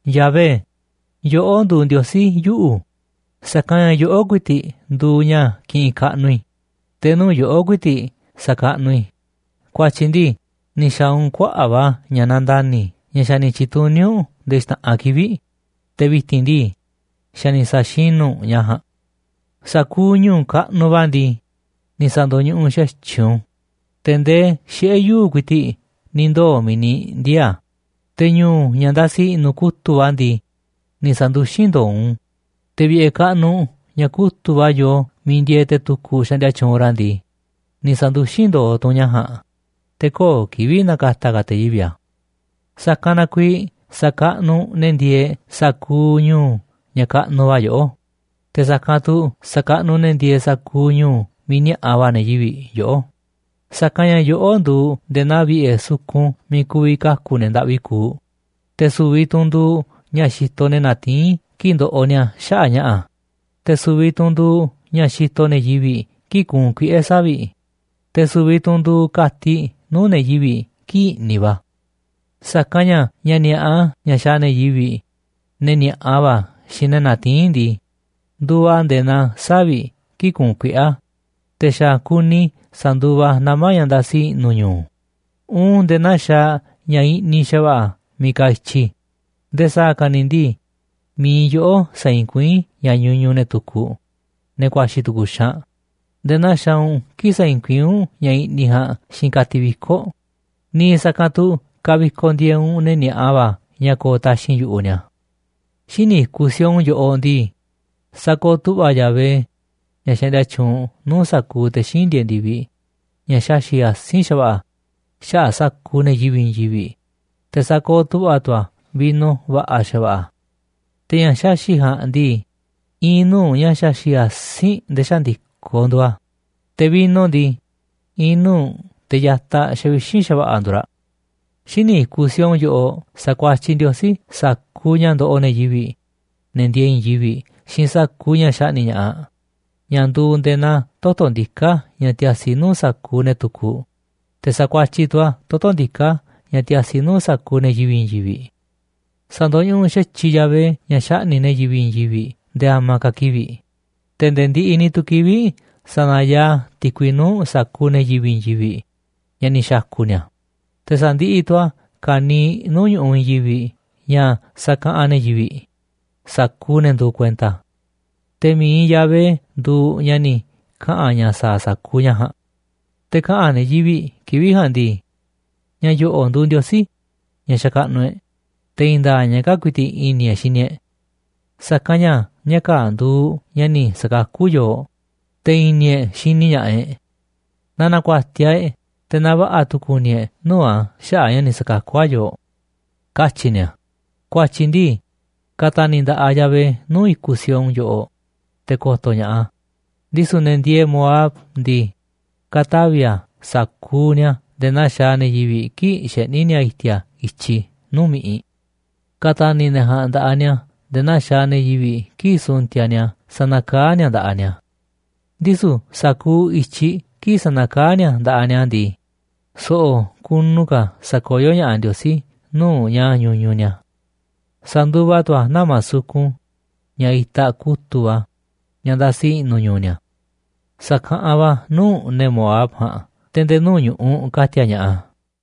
Yahvé, yoꞌó nduuꞌ Ndiosí yuꞌu̱, sa̱kanꞌ ña̱ yoꞌó ku̱i̱ti̱ꞌ nduuꞌ ña̱ kiꞌinꞌ kaꞌnuꞌ i̱, te̱ nuu̱ꞌ yoꞌó ku̱i̱ti̱ꞌ sa̱kaꞌnuꞌ i̱. Ku̱a̱tyi̱ ndii, ni̱ xa̱a̱ u̱nꞌ kuaꞌa̱ꞌ va̱ ña̱ nandani̱ ña̱ xa̱ ni̱ tyi̱tuní u̱nꞌ nde̱e̱ xta̱ꞌanꞌ kivi̱ꞌ, te̱ vi̱ti̱n ndii, xa̱ ni̱ sa̱xinu̱ u̱nꞌ ña̱ ja̱a̱nꞌ. Sa̱kuuꞌ ñu̱u̱ kaꞌnuꞌ va̱ ndii, ni̱ sa̱ndo̱ñuꞌuꞌ xa̱tyiꞌ u̱nꞌ u̱n, te̱ ndee xiꞌe̱ yuu̱ꞌ ku̱i̱ti̱ꞌ ni̱ ndoo̱ miiꞌ ni̱ ndiee̱ a̱, te̱ ñu̱u̱ ña̱ ndasi i̱ꞌnu̱ kutu̱ꞌ va̱ ndii, ni̱ sa̱nduxín ndo̱o̱ u̱nꞌ, te̱ vi̱ꞌe̱ kaꞌnuꞌ, ña̱ kutu̱ꞌ va̱ yoo miiꞌ ndieeꞌ te̱ tukuꞌ xaꞌndia tyuunꞌ ra̱ ndii, ni̱ sa̱nduxín ndo̱o̱ tu̱ u̱nꞌ ña̱ ja̱a̱nꞌ, te̱ köo̱ꞌ kivi̱ꞌ na̱ka̱ta̱ ka̱ te̱ yivi̱ꞌ a̱. Sa̱kanꞌ na kuiiꞌ sa̱kaꞌnuꞌ ne̱ ndieeꞌ sa̱kuuꞌ ñu̱u̱ ña̱ kaꞌnuꞌ va̱ yoꞌó, te̱ sa̱kanꞌ tu̱ sa̱kaꞌnuꞌ ne̱ ndieeꞌ sa̱kuuꞌ ñu̱u̱ miiꞌ ni̱a̱ꞌa va̱ ne̱ yivi̱ꞌ yoꞌó. Sa̱kanꞌ ña̱ yoꞌó nduuꞌ nde̱e̱ naa vi̱ꞌe̱ sukun miiꞌ ku̱vi̱ kaku̱ ne̱ ndaꞌvi kuuꞌ, te̱ su̱vi̱ tu̱ u̱nꞌ nduuꞌ ña̱ xitoꞌ ne̱ natiín kii̱ꞌ ndoꞌoꞌ ni̱a̱ xaꞌa̱ꞌ ña̱ꞌa̱, te̱ su̱vi̱ tu̱ u̱nꞌ nduuꞌ ña̱ xitoꞌ ne̱ yivi̱ꞌ kii̱ꞌ kuunꞌ kuiꞌe̱ savi̱ꞌ, te̱ su̱vi̱ tu̱ u̱nꞌ nduuꞌ ka̱tiꞌ nuu̱ꞌ ne̱ yivi̱ꞌ kii̱ꞌ i̱ꞌniꞌ va̱. Sa̱kanꞌ ña̱ ña̱ ni̱a̱ꞌa, ña̱ xaaꞌ ne̱ yivi̱ꞌ, ne̱ ni̱a̱ꞌa va̱ xiinꞌ ne̱ natiín ndii, nduuꞌ a̱ nde̱e̱ naa savi̱ꞌ kii̱ꞌ kuunꞌ kuiꞌe̱ a̱, te̱ xa̱ kuni sa̱nduva a̱ nama̱ ña̱ ndasi i̱ꞌnu̱ ñu̱u̱, uun nde̱e̱ naa xaaꞌ ña̱ i̱ꞌniꞌ xa̱va̱ꞌa̱ miiꞌ kaaꞌ i̱tyi. Nde̱e̱ sa̱a̱ ka̱ ni̱ ndii, mi̱iꞌ yoꞌó saiinꞌ kuiín ña̱ ñuñuꞌ ne̱ tukuꞌ, ne̱ ku̱a̱xi̱ tu̱ku̱ xaanꞌ, nde̱e̱ naa xaaꞌ u̱nꞌ kii̱ꞌ saiinꞌ kuiín u̱nꞌ ña̱ i̱ꞌniꞌ ja̱a̱nꞌ xiinꞌ ka̱tiꞌ viko̱ꞌ. Niiꞌ sa̱kanꞌ tu̱ kavikoꞌ ndi̱e̱eꞌ u̱nꞌ ne̱ ni̱a̱ꞌa va̱ ña̱ ko̱o̱ taxi̱nꞌ yu̱ꞌuꞌ ni̱a̱. Xíniꞌ i̱kuꞌ Sión yoꞌoꞌ ndii, sakooꞌ tu̱ꞌva̱ Yahvé, ña̱ xaꞌndia tyuunꞌ nuu̱ꞌ sa̱kuuꞌ te̱ xíinꞌ ndieeꞌ ndi̱viꞌ, ña̱ xaxi̱ꞌ asi̱nꞌ xa̱va̱ꞌa̱ xaꞌa̱ꞌ sa̱kuuꞌ ne̱ yivi̱ꞌ i̱i̱n yivi̱ꞌ, te̱ sakooꞌ tu̱ꞌva̱ tu̱ a̱ vino va̱ꞌa̱ xa̱va̱ꞌa̱. Te̱ ña̱ xaxi̱ꞌ ja̱a̱nꞌ ndii, i̱i̱n nuu̱ꞌ ña̱ xaxi̱ꞌ asi̱nꞌ nde̱e̱ xaꞌa̱n ndi̱koꞌ nduuꞌ a̱, te̱ vino ndii, i̱i̱n nuu̱ꞌ teꞌ ya̱taꞌ xavixínꞌ xa̱va̱ꞌa̱ nduuꞌ raꞌ. Xíniꞌ i̱kuꞌ Sión yoꞌoꞌ sa̱kuatyiꞌ Ndiosí sa̱kuuꞌ ña̱ ndoꞌoꞌ ne̱ yivi̱ꞌ, ne̱ ndiee i̱i̱n yivi̱ꞌ, xiinꞌ sa̱kuuꞌ ña̱ xaꞌni̱ꞌ ña̱ꞌaꞌ, ña̱ nduuꞌ nde̱e̱ naa toto̱ ndiká ña̱ tiasi nuu̱ꞌ sa̱kuuꞌ ne̱ tukuꞌ, te̱ sa̱kuatyiꞌ tu̱ a̱ toto̱ ndiká ña̱ tiasi nuu̱ꞌ sa̱kuuꞌ ne̱ yivi̱ꞌ i̱i̱n yivi̱ꞌ. Sa̱ndo̱ñuꞌuꞌ xa̱tyiꞌ Yahvé ña̱ xaꞌni̱ꞌ ne̱ yivi̱ꞌ i̱i̱n yivi̱ꞌ nde̱e̱ a̱ma̱a̱ ka̱ ni̱ kivi̱ꞌ, te̱ nde̱e̱ ndiꞌiꞌ ni̱ tu̱ kivi̱ꞌ sa̱na̱yaaꞌ a̱ ti̱kui nuu̱ꞌ sa̱kuuꞌ ne̱ yivi̱ꞌ i̱i̱n yivi̱ꞌ ña̱ ni̱ xa̱ku̱ ni̱a̱. Te̱ sa̱ndiꞌiꞌ tu̱ a̱ ka̱niiꞌ nuu̱ꞌ ñu̱ꞌuꞌ i̱i̱n yivi̱ꞌ ña̱ sakaꞌanꞌ ne̱ yivi̱ꞌ, sa̱kuuꞌ ne̱ nduuꞌ kuenta a̱. Te̱ mi̱iꞌ Yahvé nduuꞌ ña̱ ni̱ kaꞌa̱n ña̱ sa̱a̱ a̱ sa̱kuuꞌ ña̱ ja̱a̱nꞌ. Te̱ kaꞌa̱n ne̱ yivi̱ꞌ kivi̱ꞌ ja̱a̱nꞌ ndii: “Ña̱ yo̱ꞌo̱ꞌ nduuꞌ Ndiosí ña̱ xakaꞌnuꞌ e̱ꞌ. Te̱ i̱i̱n nda̱a̱ꞌ ña̱ kaa̱ꞌ ku̱i̱ti̱ꞌ i̱ni̱ e̱ꞌ xini e̱ꞌ, sa̱kanꞌ ña̱ ña̱ kaa̱ꞌ nduuꞌ ña̱ ni̱ sa̱kakú yooꞌ, te̱ i̱ni̱ e̱ꞌ xini ña̱ꞌaꞌ e̱ꞌ. Na na̱ku̱a̱tiaꞌ e̱ꞌ, te̱ na va̱ꞌa̱ tu̱ ku̱ni̱ e̱ꞌ nuu̱ꞌ a̱ xaꞌa̱ꞌ a̱ ña̱ ni̱ sa̱kakú a̱ yooꞌ”, katyi̱ ni̱a̱. Ku̱a̱tyi̱ ndii, ka̱ta̱ni̱ nda̱ꞌaꞌ Yahvé nuu̱ꞌ i̱kuꞌ Sión yoꞌoꞌ, te̱ ko̱to̱ ña̱ꞌaꞌ a̱. Ndisu̱ ne̱ ndieeꞌ Moab ndii, ka̱tavi̱ a̱ sa̱kuuꞌ ni̱a̱ nde̱e̱ naa xaaꞌ ne̱ yivi̱ꞌ kii̱ꞌ xeꞌní ni̱a̱ i̱ti̱a̱ i̱tyiꞌ nuu̱ꞌ mi̱ꞌiꞌ. Ka̱ta̱ni̱ ne̱ ja̱a̱nꞌ nda̱ꞌaꞌ ni̱a̱ nde̱e̱ naa xaaꞌ ne̱ yivi̱ꞌ kii̱ꞌ su̱ntiaꞌ ni̱a̱ sanakaá ni̱a̱ nda̱ꞌaꞌ ni̱a̱. Ndisu̱ sa̱kuuꞌ i̱tyiꞌ kii̱ꞌ sanakaá ni̱a̱ nda̱ꞌaꞌ ni̱a̱ ndii, so̱ꞌo̱ kunu ka̱ sa̱koyó ña̱ꞌaꞌ Ndiosí nuu̱ꞌ ña̱ ñuñuꞌ ni̱a̱. Sa̱nduva tu̱ a̱ nama̱ sukun ña̱ itaꞌ kutu̱ꞌ va̱, ña̱ ndasi i̱ꞌnu̱ ñu̱u̱ ni̱a̱, sa̱kaꞌanꞌ va̱ a̱ nuu̱ꞌ ne̱ Moab ja̱a̱nꞌ te̱ nde̱e̱ nuu̱ꞌ ñu̱ꞌuꞌ ka̱ti̱a̱ ña̱ꞌaꞌ a̱.